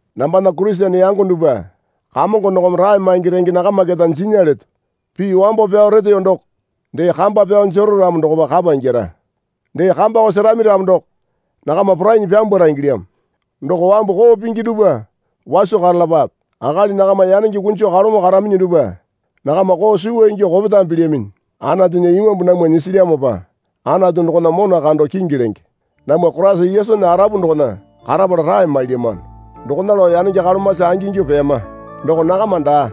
Nambana Kurisene yango dupwa Kamongo dokome rae maingi renge nakama keta jinya leto. Pii wambo pyao reteyo doko dee kamba pyao jero ramo dokopa kapa ingyara. Dee kambako serami ramo doko nakama porainyi pyambwara ingilyamo. Doko wambu koo pingi dupwa waso karalapape. Akali nakama yanenge kunjo kalomo karaminyi dupwa nakama koo suwa ingyuo kopetame pilyaminyi. Anatunya Imambu namwa nyisilyamopa Anatu dokona mona kando kingi lenge. Namwa Koraisa Yesunya arapu dokona karapala rae mailyamano. Dokona lao yanenge kolomasi angingyuo peyama. Doko nakama daa.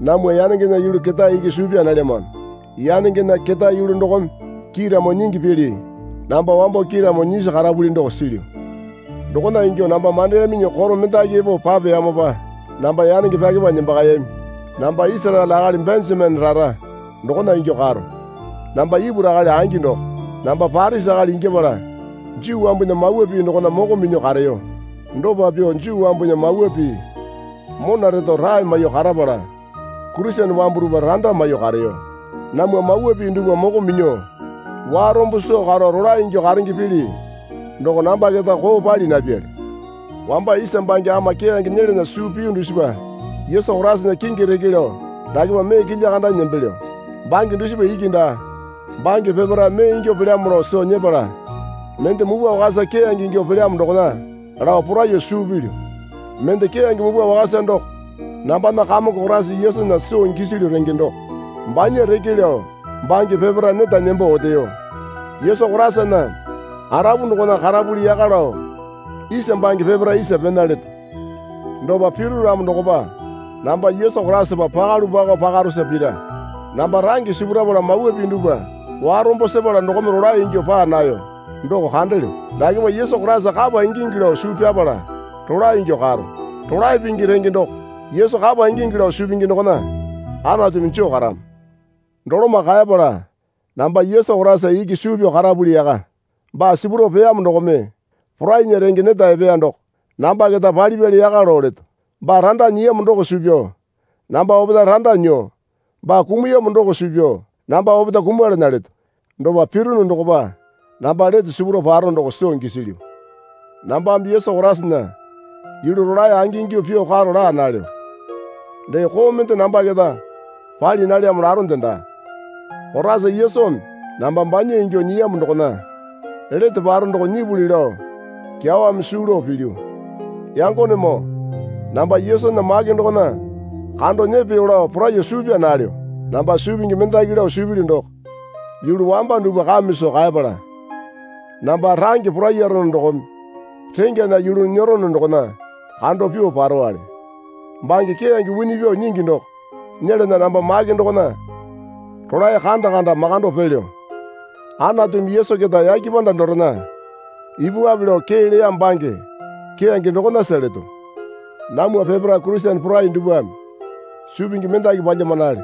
Namwa yanengena yulu ketae iki suu pyaa nalyamano. Yanengena ketae yulu dokome kiiramo nyingi pili namba wambo kiiramo nyisi karapuli doko silyu. Dokona ingyuo namba mandeyaminyi koro mendaki epo papeyamopa namba yanenge pyakepanyi nembakayami. Namba Isaraele akali Benjamene rara dokona ingyuo karo. Namba Ipuru akali angi doko. Namba Parisi akali ingyapala Juu wambunya Mawa Pii dokona moko minyuo kareyo. Dopa pyuo Juu wambunya Mawa Pii mona reto rae maiyuo karapala Kurisene wambu dupwa randa maiyuo kareyo. Namwa Mawa Pii dupwa moko minyuo warombo soo karo rolae ingyuo karenge pili doko namba keta koo pali napyali. Wamba isa bange ama keyange nyelana suu piyu dusipa Yesu Koraisana kingi reke lao dakepa mee kilya kandanyi nembelyo. Bange dusipa iki daa. Bange peparae mee ingyuo pelyamo lao soo nyepala mende mupwa wakasa keyange ingyuo pelyamo dokona lao poraiyuo suu pilyu. Mende keyange mupwa wakasa doko nambana Kamongo Koraisa Yesunya soo gisilyu renge doko. Banya reke lao bange peparae neta nembo oteyo. Yesu Koraisana arapu dokona karapuli yaka lao isa bange peparae isa pena leto. Dopa piru ramo dokopa namba Yesu Koraisapa pakalu pakao pakarosa pira. Namba range sipurapala Mawa Pii dupwa warombo sepala dokome rolae ingyuo paa nayo doko kandelyo. Dakepa Yesu Koraisa kapa ingingi lao suu pyapala rolae ingyuo karo. Rolae pingi renge doko Yesu kapa ingingi lao suu pingi dokona Anatumi joo karamo. Doloma kaepala namba Yesu Koraisa iki suu pyao karapuli yaka. Baa sipurao peyamo dokome porainya renge neta epeya doko namba keta palipyali yaka lao leto. Baa randa nyiyamo doko suu pyao namba opetae randa nyuo baa kumuyamo doko suu pyao namba opetae kumalana leto. Dopa pirunu dokopa namba lete sipurao paro doko soo gisilyu. Nambame Yesu Koraisana yulu rolae angingyuo pyuo karo laa nalyo. Dee koo mende namba keta pali nalyamo laronde daa. Koraisa Yesumi namba banya ingyuo nyiyamo dokona lete paro doko nyipuli lao kyawame suu lao pilyu. Yangonemoo namba Yesunya make dokona kando nyepeyo lao poraiyuo suu pyaa nalyo. Namba suu pingi mendaki lao suu pilyu doko yulu wamba dupwa kame soo kaepala namba range poraiyaro dokome rengyana yulu nyerono dokona kando pyuo parowale. Bange keyange wini pyuo nyingi doko nyelana namba make dokona rolae kanda kanda makando pelyo. Anatumi Yesu keta yake panda dorena ipupwape lao kee leya bange keyange dokonasa leto. Namwa peparae Kurisene porai dupwame suu pingi mendaki palyamanale.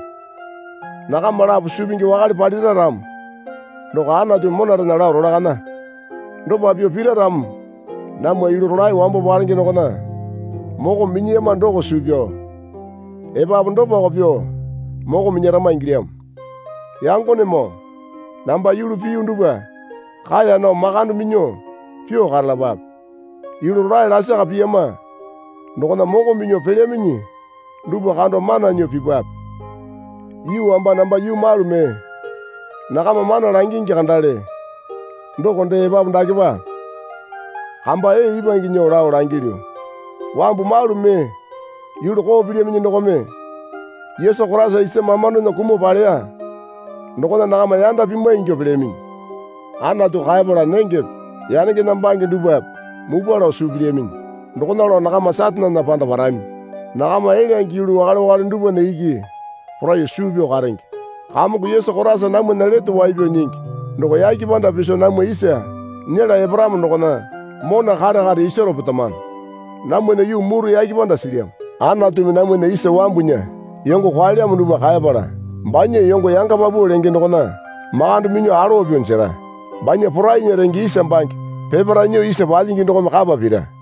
Nakama lapo suu pingi wakale palira ramo doko Anatumi monarena lao rolakaya. Dopa pyuo pira ramo namwa yulu rolae wambo palenge dokona moko minyiyama doko suu pyao epapu dopako pyuo moko minyarama ingilyamo. Yangonemoo namba yulu piyu dupwa kaeya nao makande minyuo pyuo karalapape. Yulu rolae lasaka piyama dokona moko minyuo pelyaminyi dupwa kando mana nyuo pipwape. Yuu wamba namba yuu malu mee nakama mana langingi kandale doko dee epapu dakepa kamba ee ipwange nyuo lao langilyu. Wambu malu mee yulu koo pilyaminyi dokome Yesu Koraisa isa mamandona kumuo paleya dokona nakama yanda pimwai ingyuo pelyaminyi. Anatu kaepala nengepe yanengena bange dupwape mupwa lao suu pilyaminyi. Dokona lao nakama Satanena panda parami. Nakama elyange yulu wakale wakale dupwana iki poraiyuo suu pyao karenge. Kamongo Yesu Koraisa namwana Lete Wai Pyao Nyingi doko yake panda piso namwa isa nyela eparamo dokona mona kare kare isaro petamano. Namwana yuu muru yake panda silyamo. Anatumi namwana isa wambunya yongo kwaelyamo dupwa kaepala banya yongo yanga paupau lenge dokona makande minyuo alowa pyuo jera. Banya porainya renge isa bange peparae nyuo isa palyingi dokome kapa pira.